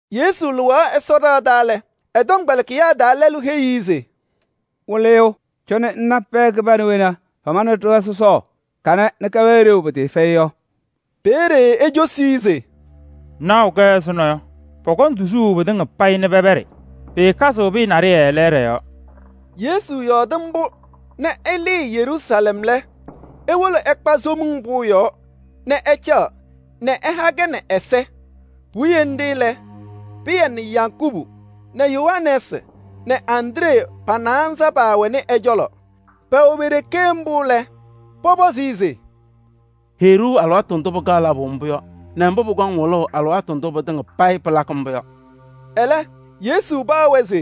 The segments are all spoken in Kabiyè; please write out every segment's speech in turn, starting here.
Yesu lɩɣaɣ Ɛsɔ ɖɩɣa taa lɛ, ɛ-tɔmkpɛlɩkɩyaa taa lɛlʋ heyi-i se: “Wɩlɩyʋ, cɔnɩ ŋna pɛɛ kɩbana wena pamanɩ ɖɩɣa sɔsɔɔ kanɛ nɛ kɛwɛɛ ɖeu pɩtɩɩfɛyɩ yɔ.” Peeye ecosi-i se: “Ŋnaɣʋ-kɛ ɛzʋnɔ yɔ, pɔkɔŋ tuzuu pɩtɩŋa payɩ nɛ pɛpɛɖɩ. Pɩɩkazɩɣ pɩyɛ naɖɩyɛ lɛɛɖɛ yɔɔ.” Yesu yɔɔdɩ mbʋ nɛ ɛlɩɩ Yeruusalɛm lɛ, ewolo ɛkpa Somiŋ Pʋʋ yɔɔ nɛ ɛcaɣ nɛ ɛha-kɛ nɛ ɛza. Puwiye nɖɩ lɛ, Pɩyɛ nɛ Yakubu nɛ Yohanɛɛsɩ nɛ Andree pa-naanza paawɛnɩ ɛ-cɔlɔ. Pɛwɛ pe-ɖeke mbʋ lɛ, pɔpɔzɩ-ɩ se: “Heyi-ɖʋ alɩwaatʋ ndʋ pɩkaɣ labʋ mbʋ yɔ nɛ mbʋ pʋkɔŋ wɩlʋʋ alɩwaatʋ ndʋ pɩtɩŋa payɩ pɩlakɩ mbʋ yɔ.” Ɛlɛ, Yesu paɣ-wɛ se: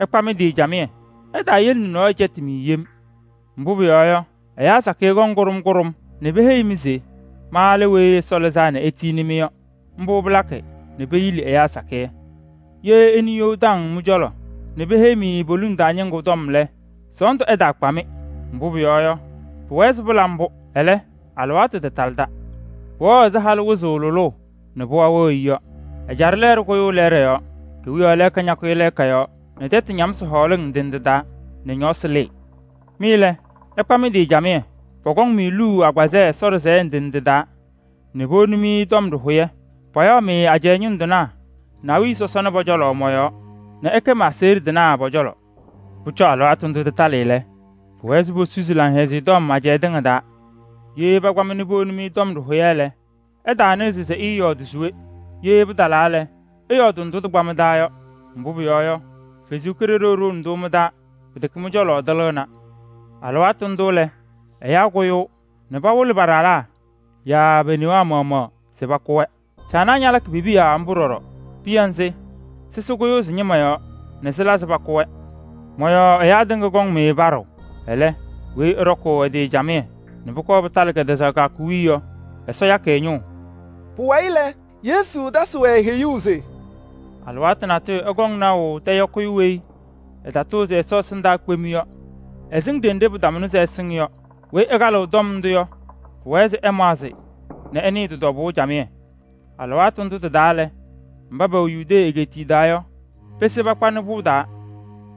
“Ɩkpa mɩ-tɩ camɩyɛ, ɩtaayele nɛ nɔɔyʋ cɛtɩ-mɩ yem. Mbʋ pʋyɔɔ yɔ, ɛyaa sakɩyɛ kɔŋ kʋɖʋm kʋɖʋm nɛ peheyi-mɩ se: ‘Ma lɛ Weyi Ɛsɔ Lɩzaa nɛ etiyini-mɩ’ yɔ: mbʋ palakɩ nɛ peyili ɛyaa sakɩyɛ. Ye ɩnɩ you taŋ mɩ-cɔlɔ nɛ peheyiɣ-mɩ poliŋ taa ñɩŋgʋ tɔm lɛ, sɔɔndʋ ɛtaakpa-mɩ. Mbʋ pʋyɔɔ yɔ, pʋwɛɛ se pɩla mbʋ. Ɛlɛ, alɩwaatʋ tatalɩda. Pʋwɛɣ ɛzɩ halʋ wɩzʋʋ lʋlʋʋ nɛ pɩɣa wɩɣ-ɩ yɔ. Ɛjaɖɛ lɛɛɖɛ kʋyʋʋ lɛɛɖɛ yɔɔ, kewiyaɣ lɛɛka ñakʋyɩ lɛɛka yɔɔ nɛ tɛtʋ ñamsɩ hɔɔlɩŋ ndɩ ndɩ taa nɛ ñɔɔsɩ lɩɩ. “Mɩ lɛ, ɩkpa mɩ-tɩ camɩyɛ. Pɔkɔŋ-mɩ luu agbazɛɛ Ɛsɔ ɖɩsɛyɛ ndɩ ndɩ taa nɛ powoni-mɩ tɔm ɖɩhʋyɛ. Payaɣ-mɩ ajɛɛ ñʋŋ tɩnaa nɛ awiya sɔsɔna pɔ-cɔlɔ mɔ-yɔɔ nɛ ɩkɛ ma-aseɣɖe tɩnaa pɔ-cɔlɔ. Pʋcɔ alɩwaatʋ ndʋ tɩtalɩ lɛ, pʋwɛɛ se posusi Laŋhɛzɩyɛ Tɔm ajɛɛ tɩŋa taa. Ye pakpa-mɩ nɛ powoni tɔm ɖɩhʋyɛ lɛ, ɩtaanɩɣzɩ se ɩɩyɔɔdɩ se we. Ye pɩtalaa lɛ, ɩyɔɔdɩ ndʋ tɩkpa mɩ-taa yɔ. Mbʋ pʋyɔɔ yɔ, Ɛsɔ Kalɩzaɣ ɖʋʋnɩ-tʋ mɩ-taa, pɩtɛkɛ mɩ-cɔlɔ tɩlɩɣna. Alɩwaatʋ ndʋ lɛ, ɛyaa kʋyʋʋ nɛ pawɩlɩ pa-ɖalaa yaa pe-newaa maɣmaɣ se pakʋ-wɛ. Caanaa ñalakɩ pe-piya mbʋ ɖɔɖɔ. Piya nzɩ, sɩsɩ kʋyɩ sɩ-ñɩma yɔɔ nɛ sɩla nɛ pakʋ-wɛ. Mɔ-yɔɔ ɛyaa tɩŋa kɔŋ-mɩ paɖʋʋ. Ɛlɛ, weyi ɛɖɔkʋʋ ɛ-tɩ camɩyɛ nɛ pʋkɔɔ pɩtalɩ kɛtɛzaɣ kɩyakʋ wiye yɔ, Ɛsɔ yakɩ ɛ-ñʋʋ.” Pʋwayɩ lɛ, Yesu tasɩ-wɛ heyuu se: “Alɩwaatʋ natʋyʋ ɩkɔŋ naʋ tɛyɔkɩyʋ weyi ɛtatʋʋzɩ Ɛsɔ ɛsɩndaa kpem yɔ, ɛsɩŋ ɖenɖe pɩtamʋnɩ se ɛsɩŋ yɔ. Weyi ɛkalɩɣ tɔm ndʋ yɔ, pʋwɛɛ se ɛmaɣzɩ nɛ ɛnɩɩ tɩ-tɔbʋʋ camɩyɛ. Alɩwaatʋ ndʋ tɩtalaa lɛ, mba pɛwɛ Yudee egeetiye taa yɔ, pese pakpanɩ pʋŋ taa.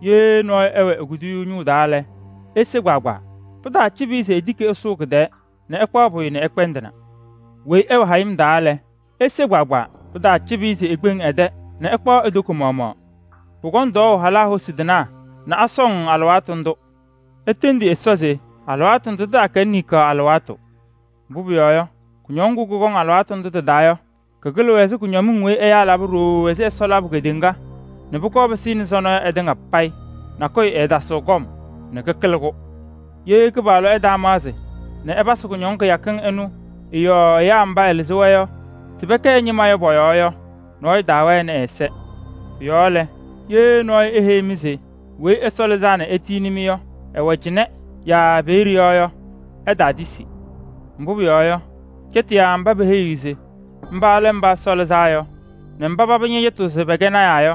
Ye nɔɔyʋ ɛwɛ e-kuduyuu ñʋʋ taa lɛ, ese kpaagbaa. Pɩtaacɩbɩ-ɩ se etiki ɛsʋʋ kɩ-tɛɛ nɛ ɛkpaɣ pʋyʋ nɛ ɛkpɛndɩna. Weyi ɛwɛ hayɩm taa lɛ, ese kpaagbaa. Pɩtaacɩbɩ-ɩ se ekpeŋ ɛ-tɛ nɛ ɛkpaɣ e-toko maɣmaɣ. Pʋkɔŋ tɔɔʋ halaa hosi tɩnaa nɛ asɔŋ alɩwaatʋ ndʋ. Itendi Ɛsɔ se alɩwaatʋ ndʋ tɩtaakɛnɩ niŋkaɣ alɩwaatʋ. Mbʋ pʋyɔɔ yɔ, kʋñɔŋ ŋgʋ kʋkɔŋ alɩwaatʋ ndʋ tɩ-taa yɔ, kɩkɩlɩɣ kʋñɔmɩŋ weyi ɛyaa laba ɖooo ɛzɩ Ɛsɔ labʋ kedeŋa nɛ pʋkɔɔ pɩsɩnɩ sɔnɔ yɔ ɩtɩŋa payɩ. Nakʋyʋ ɛɛtasɩɣ kɔm nɛ kɩkɩlɩ-kʋ. Ye Kɩpaɣlʋ ɛtaamaɣzɩ nɛ ɛpasɩ kʋñɔŋ kɩyakɩŋ ɩnʋ ɩ-yɔɔ ɛyaa mba ɛlɩzɩ-wɛ se pɛkɛ ɛ-ñɩma yɔ pɔ-yɔɔ yɔ, nɔɔyʋ taawɛnɩ ɛ-ɛza. “Pʋ-yɔɔ lɛ, ye nɔɔyʋ eheyi-mɩ se Weyi Ɛsɔ Lɩzaa nɛ etiyini-mɩ yɔ, ɛwɛ cɩnɛ yaa peeye yɔ yɔ, ɩtaatisi. Mbʋ pʋyɔɔ yɔ, cɛtɩyaa mba peheyiɣ se mba lɛ Mba Ɛsɔ Lɩzaa Yɔ nɛ mba paba ñɛcɛtɩɣ se pɛkɛ lɔɔyɩsɩ tɩnaa yɔ,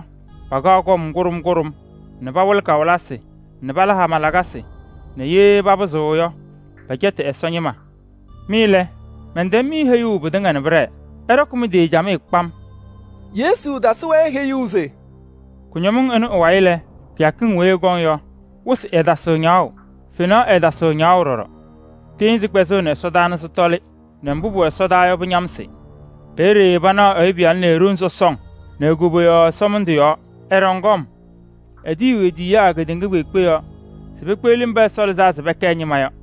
pakaɣ kɔm kʋɖʋm kʋɖʋm nɛ pawɩlɩ kawɩlɩsɩ nɛ pala hama lakasɩ nɛ ye papɩzɩɣ yɔ, pɛcɛtɩ Ɛsɔ ñɩma. Mɩ lɛ, mɛntɛm-mɩ heyuu pɩtɩŋa nɛ pɩɖɛɛ. Ɩɖɔkɩ mɩ-tɩ camɩyɛ kpam.” Yesu tasɩ-wɛ heyuu se: “Kʋñɔmɩŋ ɩnʋ ɩ-wayɩ lɛ, kɩyakɩŋ weyi ɩkɔŋ yɔ, wɩsɩ ɛɛtasɩɣ ñaɣʋ, fenaɣ ɛɛtasɩɣ ñaɣʋ ɖɔɖɔ. Tɩɩnzɩ kpɛzɩɣnɩ ɛsɔdaa nɛ sɩtɔlɩ nɛ mbʋ pʋwɛ ɛsɔdaa yɔ, pɩñamsɩ. Peeye panaɣ Ɛyʋ Pɩyalʋ nɛ e-ɖoŋ sɔsɔŋ nɛ e-koboyaɣ ɛsɔmɩndʋ yɔɔ, ɛɖɔŋ kɔm. Etiyiɣ e-tiyiyaa kedeŋa kpeekpe yɔɔ se pekpeɣli mba Ɛsɔ lɩzaa se pɛkɛ ɛ-ñɩma yɔ.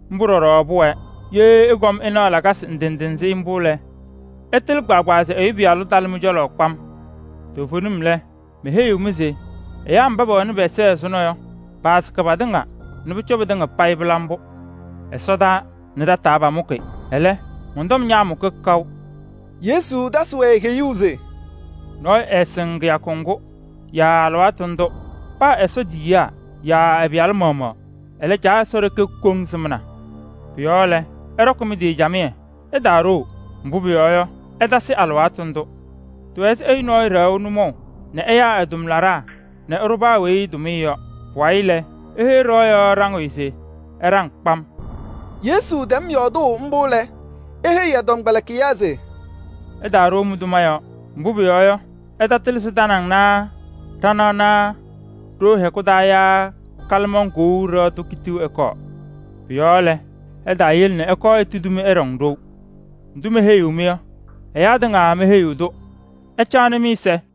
Mbʋ ɖɔɖɔ pʋwɛɛ. Ye ɩkɔm ɩnaɣ lakasɩ ndɩ ndɩ nzɩ mbʋ lɛ, ɩtɩlɩ kpaagbaa se Ɛyʋ Pɩyalʋ talɩ mɩ-cɔlɔ kpam. Toovenim lɛ, meheyiɣ-mɩ se: ɛyaa mba pɛwɛnɩ pɛ-ɛza ɛzʋnɔ yɔ, paasɩkɩ patɩŋa nɛ pʋcɔ pɩtɩŋa payɩ pɩla mbʋ. Ɛsɔtɔnʋʋ nɛ tɛtʋ pamʋkɩ, ɛlɛ, mɔn-tɔm ñaamʋkɩ kaʋ.” Yesu tasɩ-wɛ heyuu se: “Nɔɔyʋ ɛɛsɩŋ kɩyakʋ ŋgʋ yaa alɩwaatʋ ndʋ. Paa Ɛsɔ tiyiyaa yaa ɛ-Pɩyalʋ maɣmaɣ. Ɛlɛ, Caa Ɛsɔ ɖeke koŋ sɩmna. Pʋ-yɔɔ lɛ, ɩɖɔkɩ mɩ-tɩ camɩyɛ, ɩtaaɖoo. Mbʋ pʋyɔɔ yɔ, ɩtasɩ alɩwaatʋ ndʋ. Tɩwɛ ɛzɩ ɛyʋ nɔɔyʋ ɖɛɣʋ nʋmɔʋ nɛ ɛyaa ɛ-tʋmlaɖaa nɛ ɛɖʋ paa weyi tʋmɩyɛ yɔ. Pʋwayɩ lɛ, eheyi ɖɩɣa yɔɔ ɖaŋɩyʋ se ɛɖaŋ kpam.” Yesu tɛm yɔɔdʋʋ mbʋ lɛ, eheyi ɛ-tɔmkpɛlɩkɩyaa se: “Ɩtaaɖoo mɩ-tʋma yɔɔ. Mbʋ pʋyɔɔ yɔ, ɩtatɩlɩ se tanaŋ naa ɖanaɣ naa ɖoo hɛkʋ taa yaa kalɩmaŋ kou ɖɩɣa tʋ kitiɣ ɛkɔɔ. Pʋ-yɔɔ lɛ, ɩtaayele nɛ ɛkɔɔ etudi-mɩ nɛ ɩɖɔŋ ɖou. Ndʋ meheyiɣ-mɩ yɔ, ɛyaa tɩŋa meheyiɣ-tʋ. Ɩcaɣnɩ mɩ-ɛza.”